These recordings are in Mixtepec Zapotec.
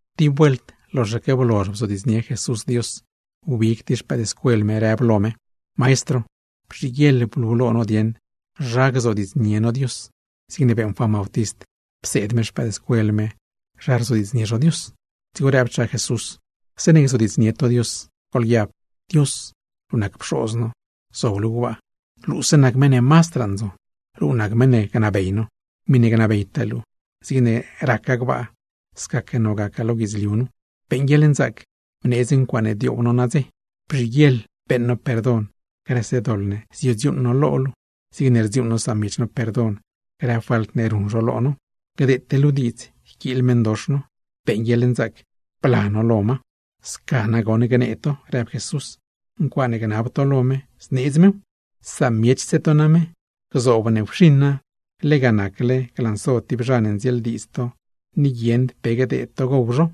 Tib vuelt, loxaque blozh bzodiidznie Jesús Dios, wbig tib xpëëdscuel me rëb lo me: ―Maestro, bzhiguieḻ blu lo no dieṉ zha gzodiidznie no Dios, zigne beeṉ Juan Bautist pseed me xpëëdscuel me zha gzodiidznie zho Dios. Dzigo rëbchaa Jesús: ―Zeeṉe gzodiidznie to Dios, goḻguiab: Dios, luu nac Pxoz no, zob luu gbaa; luuse nac meṉ ne mazdraa ndzon. Luu nac meṉ ne gnabey no, miṉe gnabeytaa luu, zigne raca gbaa, scaque none gaca lo guidzliu nu. Beeṉ guieḻnzaac bneedz ncuaaṉe dioow no nadze. Bzhiguieḻ beeṉ no perdon grëse doḻ ne ziodziuuṉ no lo luu, zigne rdziuuṉ no samiech no perdon grë falt ne ruṉ zho lo no. Gdeete luu diidz yquiil meṉdox no, beeṉ guieḻnzaac bla no lo ma. ’Sca nagoṉ gnee to ―rëb Jesús―. Ncuaaṉe gnab to lo me zneedz mew. Samiechse to name, gzoob ne wxiṉa, lega nacle glanso tib zha ne ndzieeldiidz to ni guieṉd pe gdeed to gow zho.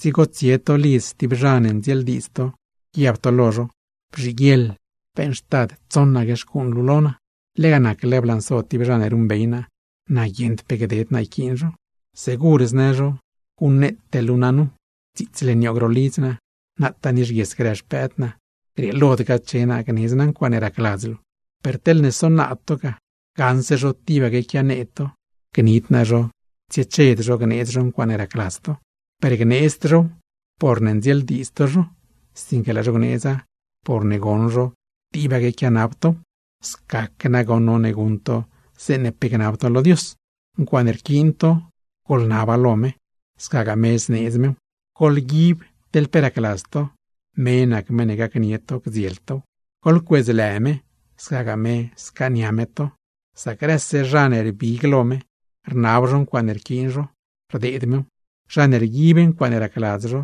Dzigo tsie to lidz stib zha ne ndzieeldiidz to guiab to lo zho: “Bzhiguieḻ beeṉxtad tsoṉaque xcuuṉ luu lo naa. Lega nacle blanso tib zha ne ruṉbey naa, na guieṉd pe gded naa yquiin zho.” Segur znë zho: “Guṉneete luu naa nu, dziitsle nioog ro lidz naa, nataa nixguies grë xpëëd naa; grieelod gache naa gnedz naa ncuaaṉe racladz luu.” Per teḻne sonaad to ga, gaṉse zho tibaque quianee to, gnid naa zho tsieched zho gneedz zho ncuaaṉe racladz to. Per gneedzd zhow porne ndzieeldiidz to zho, sinque laa zho gneedza porne goṉ zho tibaque quianab tow. Scaque nagoṉ none guṉ to, zeeṉe pe gnab to lo Dios. Ncuaaṉe rquiin to, goḻnaba lo me, scagaa me zneedz mew. Goḻguib teḻ pe racladz to, me nac meṉ ne gacnie to gdziel tow. Goḻcuedzlë me, scagaa me scaania me to. Sac grëse zha ne rbig lo me rnab zho ncuaaṉe rquiin zho, rdeed mew. Zha ne rguib ncuaaṉe racladz zho,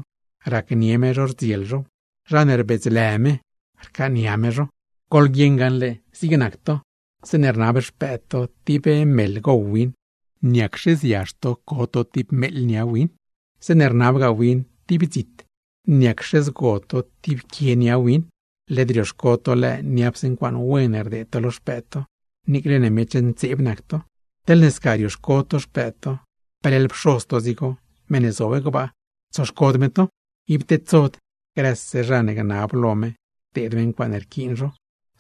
racnie me zho rdziel zhow. Zha ne rbedzlë me, rcaania me zho. ’Goḻguieṉ gaṉle, zig nac to, zeeṉe rnab xpëëd to tib meḻ gow win, ¿niacxe ziazh to co to tib meeḻ nia win? Zeeṉe rnabgaa win tib dzit, ¿niacxe zgo to tib meegu nia win? Led rioxco to lëë niapse ncuaaṉe wen rdeed to lo xpëëd to, niicle ne miech ntseeb nac to. Teḻne sca rioxco to xpëëd to, peleḻ Pxoz to dzigo, meṉ ne zob gbaa, tsoxcod me to. Ib tedsod grëse zha ne gnab lo me gdeed me ncuaaṉe rquiin zho,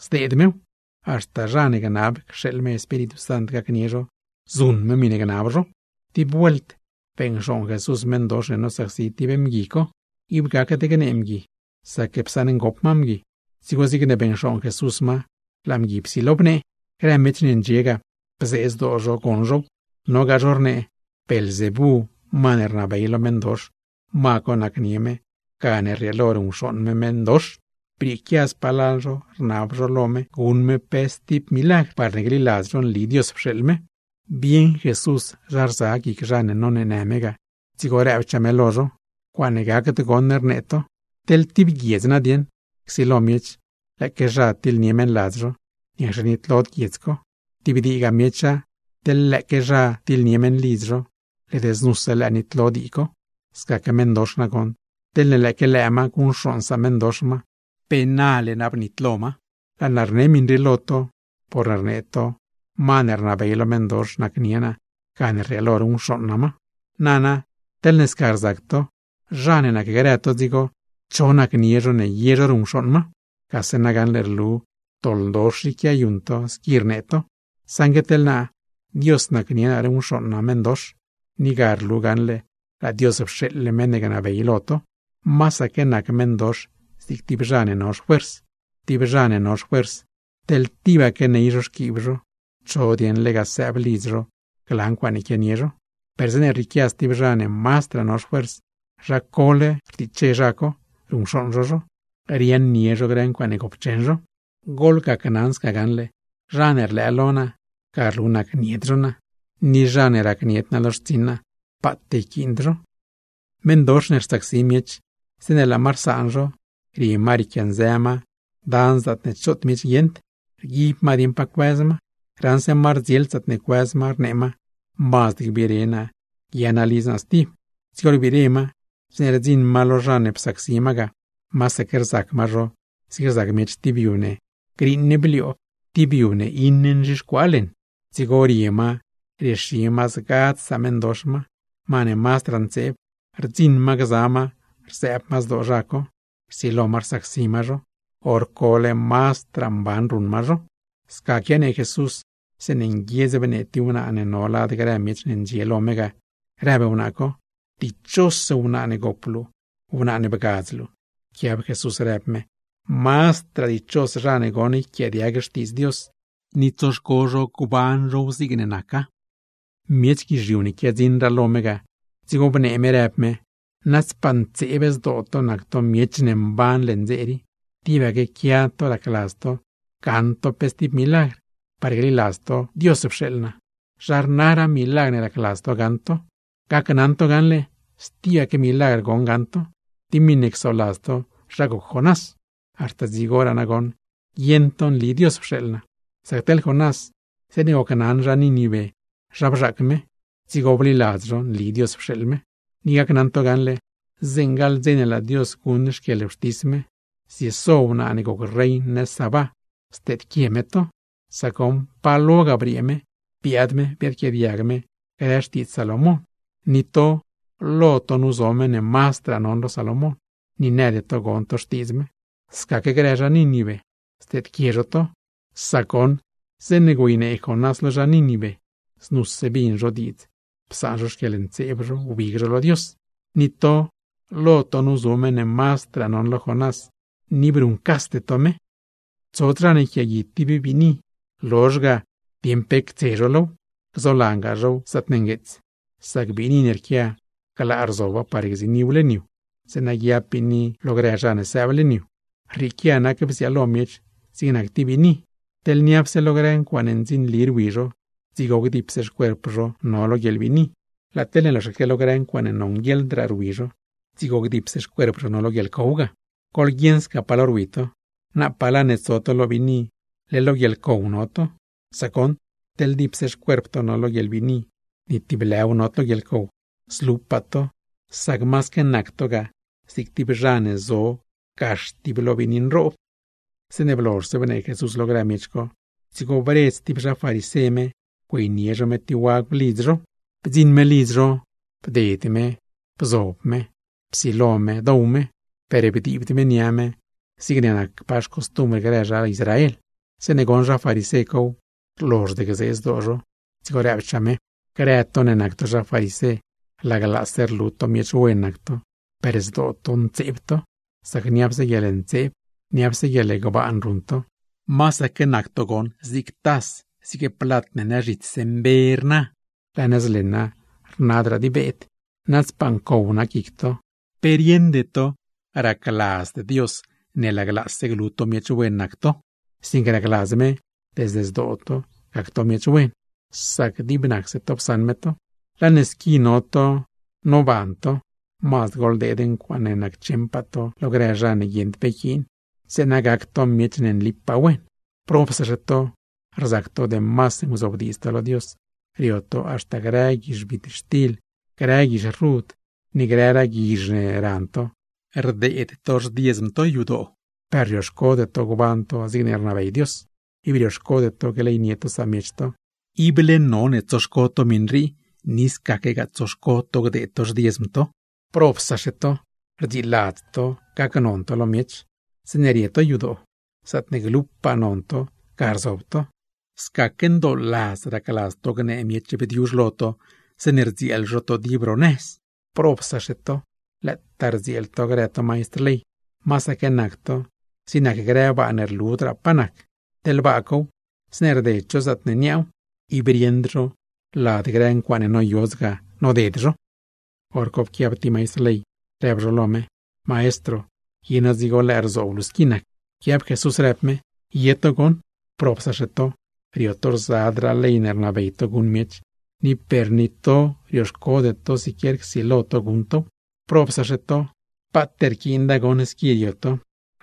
zdeed mew; haxta zha ne gnab cxeeḻ me Espíritu Sant gacnie zho, zuṉ me miṉe gnab zho. Tib vuelt beṉcxooṉ Jesús meṉdox ne nosacsi tib mgui co. Ib gacd gnee mgui, sac psaṉ ngop ma mgui. Dzigo zigne beṉcxooṉ Jesús ma, laa mgui psilo bnee. Grë miech ne ndxie ga, bzee zdoo zho goṉ zhow. Nogaa zho rnee, Beelzebú ma ne rnabey lo meṉdox, ma co nacnie me gane rrieelo ruṉcxooṉ me meṉdox. Brieequia spalal zho, rnab zho lo me guṉ me pe stib milagr, parne gliladz zho nli Dios pxeeḻ me. Bieṉ Jesús zha rza guic zha ne noneenë me ga, dzigo rëbchaa me lo zho: ―¡Ncuaaṉe gacd goṉ rnee to! Teḻ tib guiedz nadieṉ, csilo miech, lëëque zha tiḻnie meṉladz zho, ¿niacxe nitlod guiedz co? Tib diigaa miecha, teḻ lëëque zha tiḻnie meṉlidz zho, led znuse lëë nitlo dii co. Scaque meṉdox nagoṉ, teḻne lëëque lëë ma guṉcxooṉ sameṉdox ma, ¡pe nale na bnitlo ma! Laa naa rne miṉ rii lo to, porne rnee to ma ne rnabey lo meṉdox nacnie naa, gane rrieelo ruṉcxooṉ naa ma. Nana teḻne sca rzac to, ¿zha ne nacgrë to dzigo, cho nacnie zho ne ye zho ruṉcxooṉ ma? Gase nagaṉle rlu doḻdox i quiayuṉ to squi rnee to. Saṉgue teḻ naa, Dios nacnie naa ruṉcxooṉ naa meṉdox, ni ga rlu gaṉle laa Dios pxeeḻle meṉ ne gnabey lo to. ’¡Masaque nac meṉdox zig tib zha ne no xfuers! Tib zha ne no xfuers, teḻ tibaque ney zho xquiib zho, ¿cho dieṉ lega sëëb lidz zho gla ncuaaṉe quianie zho? Per zeeṉe rrieequia stib zha ne mazdraa no xfuers, zha cole rtiche zha co, ruṉcxooṉ zho zho, riaaṉnie zho grë ncuaaṉe gopcheṉ zho. Goḻgacnaṉ sca gaṉle, zha ne rlëë lo naa, ga rlu nacnied zho naa; ni zha ne racnied naa lo xtsiṉ naa, paat yquiind zho. ’Meṉdox ne rsacsi miech, zeeṉe laa ma rsaan zho, rie ma riequianzë ma dan zaatne choot miech guieṉd, rguib ma dieṉ pa cuëz ma; raṉse ma rdzield zaatne cuëz ma, rnee ma: “Mazd gbire naa guia naa lidz naa stib.” Dzigo rbire ma, zeeṉe rdziṉ ma lo zha ne psacsi ma ga, masaque rzac ma zho zig rzac miech tib yu ne griiṉ blioob, tib yu ne iṉe nzhixcuaa leṉ. Dzigo rie ma riexi ma zgadz sameṉdox ma, ma ne mazdraa ntseeb, rdziṉ ma gza ma rzëëb ma zdoo zha co, rsilo ma rsacsi ma zho. ¡Horcole mazdraa mban ruṉ ma zho! Sca quianee Jesús, zeeṉe nguiedz bnee tib wnaa ne no lad grë miech ne ndxie lo me ga, rëb wnaa co: ―¡Dichos wnaa ne gop luu, wnaa ne bgadz luu! Pquiab Jesús rëb me: ―¡Mazdraa dichos zha ne goṉ, yquiaadiag Xtiidz Dios ni tsoxco zho gban zhow zigne naca! Miech guizhiu ne quiadziṉraa lo me ga, dzigo bnee me rëb me: ―Nadzpaa ntseeb zdoo to nac to miech ne mban leṉ dze rii. Tibaque quia to racladz to gaṉ to pe stib milagr, parne gliladz to Dios pxeeḻ naa, ¿zha rnaraa milagr ne racladz to gaṉ to? Gacnaṉ to gaṉle, stibaque milagr goṉ gaṉ to, tib miṉe csoladz to zha goc Jonás. Haxta dzigoraa nagoṉ guieṉ to nli Dios pxeeḻ naa. Sac teḻ Jonás, zeeṉe gocnaṉ zha Nínive zha bzhaac me, dzigo bliladz zho nli Dios pxeeḻ me. Ni gacnaṉ to gaṉle, zeeṉe gaḻ dze ne laa Dios guṉ xquieḻwxtis me, zieso wnaa ne goc rein nëz Sabá, steedquie me to. Sac goṉ pa lo ga briee me, biaad me biadquiaadiag me grë xtiidz Salomón; ni to, lo to nu zo meṉ ne mazdraa non lo Salomón, ni nëd to gon to xtiidz me. Scaque grë zha Nínive, steedquie zho to; sac goṉ zeeṉe güeynee Jonás lo zha Nínive, znuse bin zho diidz psaan zho xquieḻntseeb zho wbig zho lo Dios; ni to, lo to nu zo meṉ ne mazdraa non lo Jonás, ni ib ruṉcasde to me. ’Tsod zha ne yquiaagui tib biini, lozh ga ctoos zho pe cos low, gzolangaa zhow zaatne ngueets. Sac biini ne rquia, glaa rzoba par gziiniw leṉ yu, zeeṉa guiab biini lo grëse zha ne sëëb leṉ yu. Rrieequia nac bziaalo miech zig nac tib biini. Teḻne niapse lo grë ncuaaṉe ndzinli rwi zho, dzigo gdipse xcuerp zho no lo guieḻbiini. Laa teḻne loxaque lo grë ncuaaṉe nonguieḻdgaa rwi zho, dzigo gdipse xcuerp zho no lo guieḻcow ga. Goḻguieṉ sca pa lo rwi to, napaa laa ne tso to lo biini, leḻ lo guieḻcow no to. Sac goṉ, teḻ dipse xcuerp to no lo guieḻbiini, ni tib lëw nod lo ncow, zlupaa to; sac masaque nac to ga zig tib zha ne zo gax tib lo biini nroob. Zeeṉe blozhse bnee Jesús lo grë miech co, dzigo bredz tib zha farisé me güeynie zho me tib wagw lidz zho. Bdziṉ me lidz zho, bded me bzob me lo mezh, psilo me dow me, per bdiibd me nia me zigne nacpaa xcostumbr grë zha Israel. Zeeṉe goṉ zha farisé cow, rlozhd gzee zdoo zho; dzigo rëbchaa me: ―Grë to ne nac to zha farisé, laglaase rlu to miech wen nac to, per zdoo to ntseeb to, sac niapse guieḻntseeb, niapse guieḻgbaan ruṉ to; masaque nac to goṉ zig tas, zig plat ne nëz zhitsse mbe rna, laa nëz leṉa rnadraa di beed. ¡Nadzpaa ncow nac guic to! ¿Pe rieṉde to racladzd Dios ne laglaase glu miech wen nac to, sinque racladz me desde zdoo to gac to miech wen? Sac dib nacse to psaṉ me to. Laa ne squi no to noban to, mazd goḻdeed ncuaaṉe naccheṉpaa to lo grë zha ne guieṉd pe yquiin, zeeṉa gac to miech ne nlipaa wen. ’¡Probsaxe to! Rzac to demas nguzobdiidz to lo Dios, rio to haxta grë guizh bitxtil, grë guizh rud, ni grëragaa guizh ne ran to, rdeed to xdiezm to yadoo; per rioxcode to gban to zigne rnabey Dios, ib rioxcode to gleynie to samiech to. Ible none tsoxco to miṉ rii, ni bii scaquegaa tsoxco to gdeed to xdiezm to. ¡Probsaxe to! Rdziladz to gacnon to lo miech, zeeṉe rie to yadoo, zaatne glupaa non to, ga rzob to; scaque ndooladz racladz to gnee miech bdiuzh lo to, zeeṉe rdzieel zho to dib ro nëz. ¡Probsaxe to, lëëtaa rdzieel to grë to maistr ley! Masaque nac to zig nac grë baa ne rludraa pa nac. Teḻ baa cow, zeeṉe rded zho zaatne niaaw, ib rieṉd zho lad grë ncuaaṉ noyodz ga, noded zho. Horco pquiab tib maistr ley, rëb zho lo me: ―Maestro, ¿ye no dzigo lëë rzoob luu squi nac? Pquiab Jesús rëb me: ―Ye to goṉ. ¡Probsaxe to! Rio to rzadraa ley ne rnabey to guṉ miech, ni per ni to rioxcode to siquier csilo to guṉ tow. ¡Probsaxe to! Paat rquiinda goṉ squi rio to,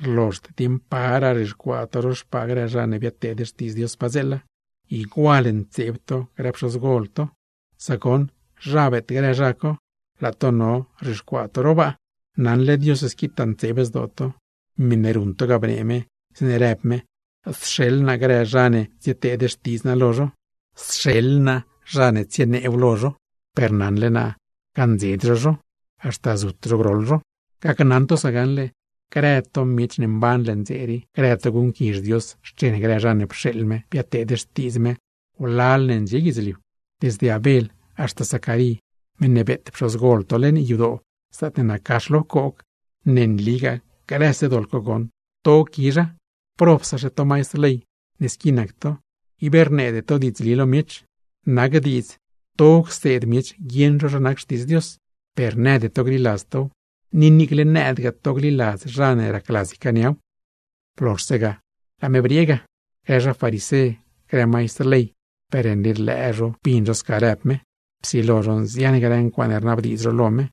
rlozhd dieeṉ paraa rzhixcuaa to ro xpaa grë zha ne biadteed xtiidz Dios padzeela. ¡Igual ntseeb to grë pxozgol to! Sac goṉ, zha beet grë zha co, laa to no rzhixcuaa to ro baa. Naṉle Dios squitaa ntseeb zdoo to, miṉe ruṉ to ga bnee me, zeeṉe rëb me: “Sxeḻ naa grë zha ne tsieteed xtidz naa lo zho, sxeḻ naa zha ne tsieneew lo zho, per naṉle naa gaṉdzed zho zho, haxta zut zho groḻ zho.” Gacnaṉ to sca gaṉle, grë to miech ne mban leṉ dze rii, grë to guṉquizh Dios xchen grë zha ne pxeeḻ me biadteed xtiidz me wlal ne ndxie guidzliu, desde Abel haxta Zacarí meṉ ne beet pxozgol to leṉ yadoo zaatne nac gax lo pcoog. ¡Ne nligaa grëse doḻ co goṉ, to quizha! ¡Probsaxe to maistr ley squi nac to, ib rneede to diidzli lo miech! Nac diidz to cseed miech guieṉ zho zha nac Xtiidz Dios, per nëde to gliladz tow, ni niicle nëëdgaa to gliladz zha ne racladz ycaaniaw. Blozhse ga, laa me briee ga. Grë zha farisé, grë maistr ley, per nli rlëë zho bin zho sca rëb me. Psilo zho nzian grë ncuaaṉe rnabdiidz zho lo me,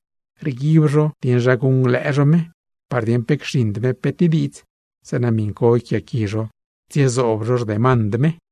rguib zho dieṉ zha guṉglëë zho me, par dieṉ pe cxiṉd me pe tib diidz, zeeṉa miṉ co yquiaaqui zho tsiezoob zho xdemand me.